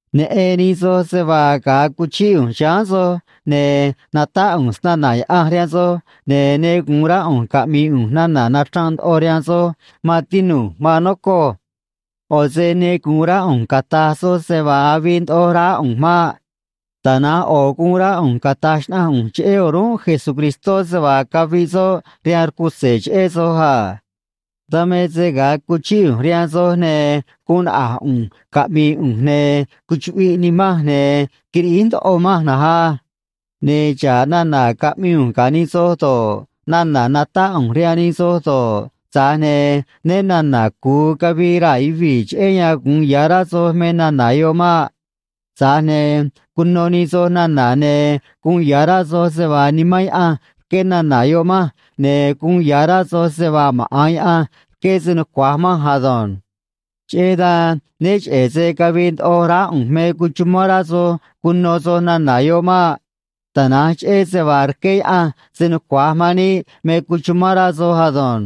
Neꞌen nij soj se vaa ga̱a cuchíꞌ ꞌu̱nj chiháán soj, ne̱ natáꞌ ꞌu̱nj snana̱ Yaꞌanj rihaan soj, ne̱ ne gu̱un rá ꞌu̱nj caꞌmi̱i̱ ꞌu̱nj nana̱ nachranꞌ ndoꞌo rihaan soj, maan tinu̱j, maan nocoj. ꞌO̱ se ne gu̱un rá ꞌu̱nj cata̱j soj se vaa avii ndoꞌo raá ꞌu̱nj maꞌ. Tana̱nj ꞌo̱ guun rá ꞌu̱nj cata̱j xnaꞌanj ꞌu̱nj cheꞌé o̱rúnꞌ Jesucristó se vaa caviꞌ soꞌ rihaan rcutze̱ cheꞌé soj a. Dan me se ga̱a cuchíꞌ ꞌu̱nj rihaan soj, ne̱ guun naꞌa̱j ꞌu̱nj caꞌmi̱i̱ ꞌu̱nj, ne̱ cuchuꞌviꞌ nimanj, ne̱ quiriꞌíj ndoꞌo manj na̱nj á. Ne̱ xa̱ꞌ nana̱ caꞌmii ꞌu̱nj ga̱ nij soj do̱ꞌ, nana̱ natáꞌ ꞌu̱nj rihaan nij soj do̱ꞌ, tza̱j ne̱ né na̱na̱ cu̱u cavii raa̱ yuvii̱ cheꞌé yan gu̱un ya̱ rá soj me nana̱ yoꞌ maꞌ. Tza̱j ne̱ cuno nij soj nana̱, ne̱ guun ya̱ rá soj se vaa Nimán Yaꞌanj rqué nana̱ yoꞌ manj, ne̱ guun ya̱ rá soj se vaa maꞌa̱n Yaꞌanj rqué se nucua̱j manj ado̱nj. Cheꞌé dan né cheꞌe̱ se cavii ndoꞌo raá ꞌu̱nj me cuchumán rá soj cuno soj nana̱ yoꞌ maꞌ. Tana̱nj cheꞌé se vaa rqué Yaꞌanj se nucua̱j man níꞌ me cuchumán rá soj ado̱nj.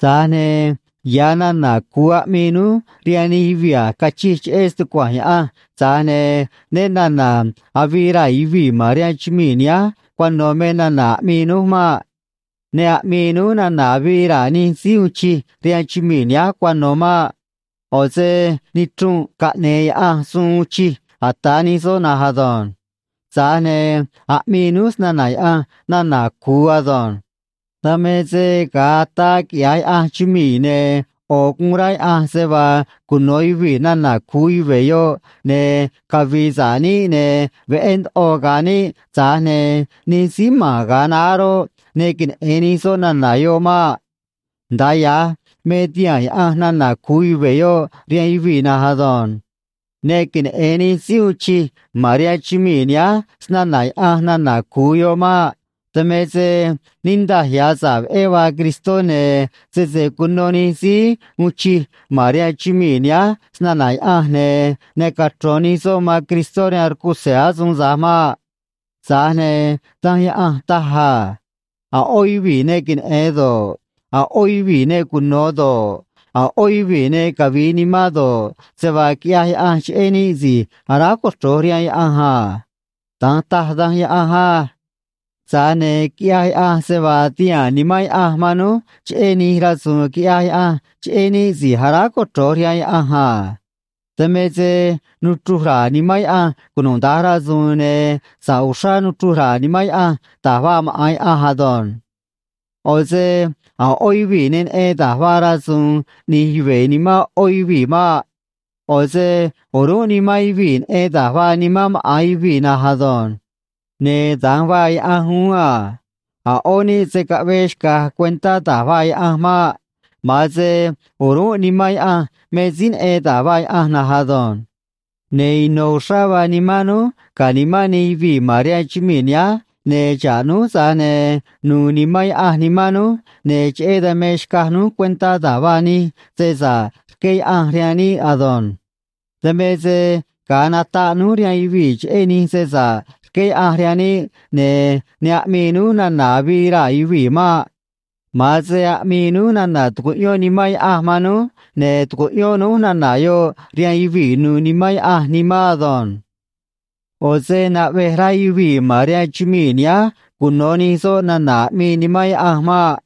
Tza̱j ne̱ ya̱ nana̱ cu̱u aꞌmii núj rihaan nij yuvii̱ a̱j cachij cheꞌé stucua̱nj Yaꞌanj, tza̱j ne̱ né na̱na̱ avii raa̱ yuvii̱ ma̱n rihaan chumii̱ nihánj cuano̱ me nana̱ aꞌmii núj maꞌ. Ne aꞌmii núj nana̱ avii raa̱ nij síí uun chij rihaan chumii̱ nihánj cuano̱ maꞌ. ꞌO̱ se nichrunꞌ caꞌne̱e̱ Yaꞌanj suun uun chij ata̱ nij soꞌ na̱nj ado̱nj. Tza̱j ne̱ aꞌmii núj snana̱ Yaꞌanj nana̱ cu̱u ado̱nj. Dan me se ga̱a ataa quiꞌya̱j Yaꞌanj chumii̱, ne̱ ꞌo̱ guun rá Yaꞌanj se vaa cuno̱ yuvii̱ nana̱ cu̱u yuve̱ yoꞌ, ne̱ cavi̱i̱ sa̱ꞌ níꞌ, ne̱ veꞌé ndoꞌo ga̱a̱ níꞌ, tza̱j ne̱ nij síí ma̱n ga̱a naá roꞌ, ne queneꞌe̱n nij soꞌ nana̱ yoꞌ maꞌ. Nda̱a ya̱j me tihaa̱n Yaꞌanj nana̱ cu̱u yuve̱ yoꞌ rihaan yuvii̱ na̱nj ado̱nj. Ne queneꞌe̱n nij síí uun chij ma̱n rihaan chumii̱ nihánj snana̱ Yaꞌanj nana̱ cu̱u yoꞌ maꞌ. Dan me se niꞌndaj ya̱ sa̱ꞌ veꞌé vaa Cristó, ne̱ sese cuno nij síí uun chij ma̱n rihaan chumii̱ nihánj snana̱ Yaꞌanj, ne̱ ne cachro̱n nij soꞌ man Cristó rihaan rcutze̱ asuun tza̱j maꞌ. Tza̱j ne̱ Danj Yaꞌanj taj a: A̱ ꞌó yuvii̱ ne queneꞌe̱n do̱ꞌ, a̱ ꞌó yuvii̱ ne cuno̱ do̱ꞌ, a̱ ꞌó yuvii̱ ne cavi̱i̱ nimán do̱ꞌ, se vaa quiꞌyaj Yaꞌanj cheꞌé níꞌ si̱j aráj cochro̱j rihaan Yaꞌanj a. Da̱nj taj Danj Yaꞌanj á. Tza̱j ne̱ quiꞌyaj Yaꞌanj se vaa tihaa̱n Nimán Yaꞌanj man núj cheꞌé nij rasu̱u̱n quiꞌyaj Yaꞌanj cheꞌé níꞌ si̱j aráj cochro̱j rihaan Yaꞌanj a. Dan me se nuchruj ra̱a̱ Nimán Yaꞌanj cunuda̱nj rasu̱u̱n, ne̱ sa̱ꞌ uxrá nuchruj ra̱a̱ Nimán Yaꞌanj da̱j vaa maꞌa̱n Yaꞌanj ado̱nj. ꞌO̱ se a̱ ꞌó yuvii̱ ne neꞌen da̱j vaa rasu̱u̱n ꞌni̱j yuve̱ nimán ꞌó yuvii̱ maꞌ. ꞌO̱ se o̱rúnꞌ nimán yuvii̱ neꞌen da̱j vaa nimán maꞌa̱n yuvii̱ na̱nj ado̱nj. Ne̱ da̱nj vaa Yaꞌanj uún a. A̱ ꞌó níꞌ se̱ caꞌvee xca̱j cuentá da̱j vaa Yaꞌanj maꞌ. Ma̱an se o̱rúnꞌ Nimán Yaꞌanj me síí neꞌen da̱j vaa Yaꞌanj na̱nj ado̱nj. Ne̱ ino̱ uxrá vaa nimán núj ga̱ nimán nij yuvii̱ ma̱n rihaan chumii̱ nihánj, ne̱ xa̱ꞌ núj, tza̱j ne̱ nu̱u̱ Nimán Yaꞌanj nimán núj, ne̱ cheꞌé dan me xcaj núj cuentá da̱j vaa nij se sa̱ꞌ rqué Yaꞌanj rihaan níꞌ ado̱nj. Dan me se ga̱a nataꞌ núj rihaan yuvii̱ cheꞌé nij se sa̱ꞌ rqué Yaꞌanj rihaan níꞌ, ne̱ ne aꞌmii núj nana̱ avii raa̱ yuvii̱ maꞌ. Ma̱an se aꞌmii núj nana̱ tucuꞌyón Nimán Yaꞌanj man núj, ne̱ tucuꞌyón núj nana̱ yoꞌ rihaan yuvii̱ nu̱u̱ Nimán Yaꞌanj nimán ado̱nj. ꞌO̱ se naꞌvej rá yuvii̱ ma̱n rihaan chumii̱ nihánj cuno̱ nij soꞌ nana̱ aꞌmii Nimán Yaꞌanj maꞌ.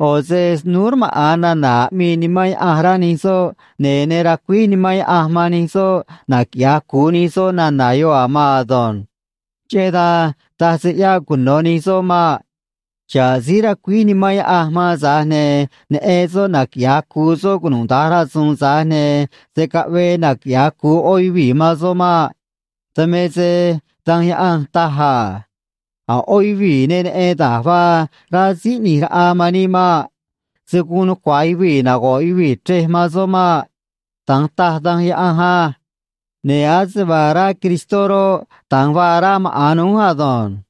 ꞌO̱ se snúú rmaꞌa̱n nana̱ aꞌmii Nimán Yaꞌanj, rá nij soꞌ, ne̱ ne racuíj Nimán Yaꞌanj man nij soꞌ naquiꞌya̱j cu̱u nij soꞌ nana̱ yoꞌ a̱ maan ado̱nj. Cheꞌé dan taj se ꞌyáꞌ cuno̱ nij soꞌ maꞌ. Xa̱ꞌ síí racuíj Nimán Yaꞌanj man, tza̱j ne̱ neꞌen soꞌ naquiꞌya̱j cu̱u soꞌ cunuda̱nj rasu̱u̱n, tza̱j ne̱ se̱ caꞌvee naquiꞌya̱j cu̱u ꞌó yuvii̱ man soꞌ maꞌ. Dan me se Danj Yaꞌanj taj a: A̱ ꞌó yuvii̱ ne neꞌen da̱j vaa rá Síí ꞌNi̱j Raꞌa man níꞌ maꞌ. Se̱ guun nucua̱j yuvii̱ nago̱ꞌ yuvii̱ chrej man soꞌ maꞌ. Da̱nj taj Danj Yaꞌanj á. Ne̱ ase vaa rá Cristó roꞌ, da̱nj vaa rá maꞌa̱n núj ado̱nj.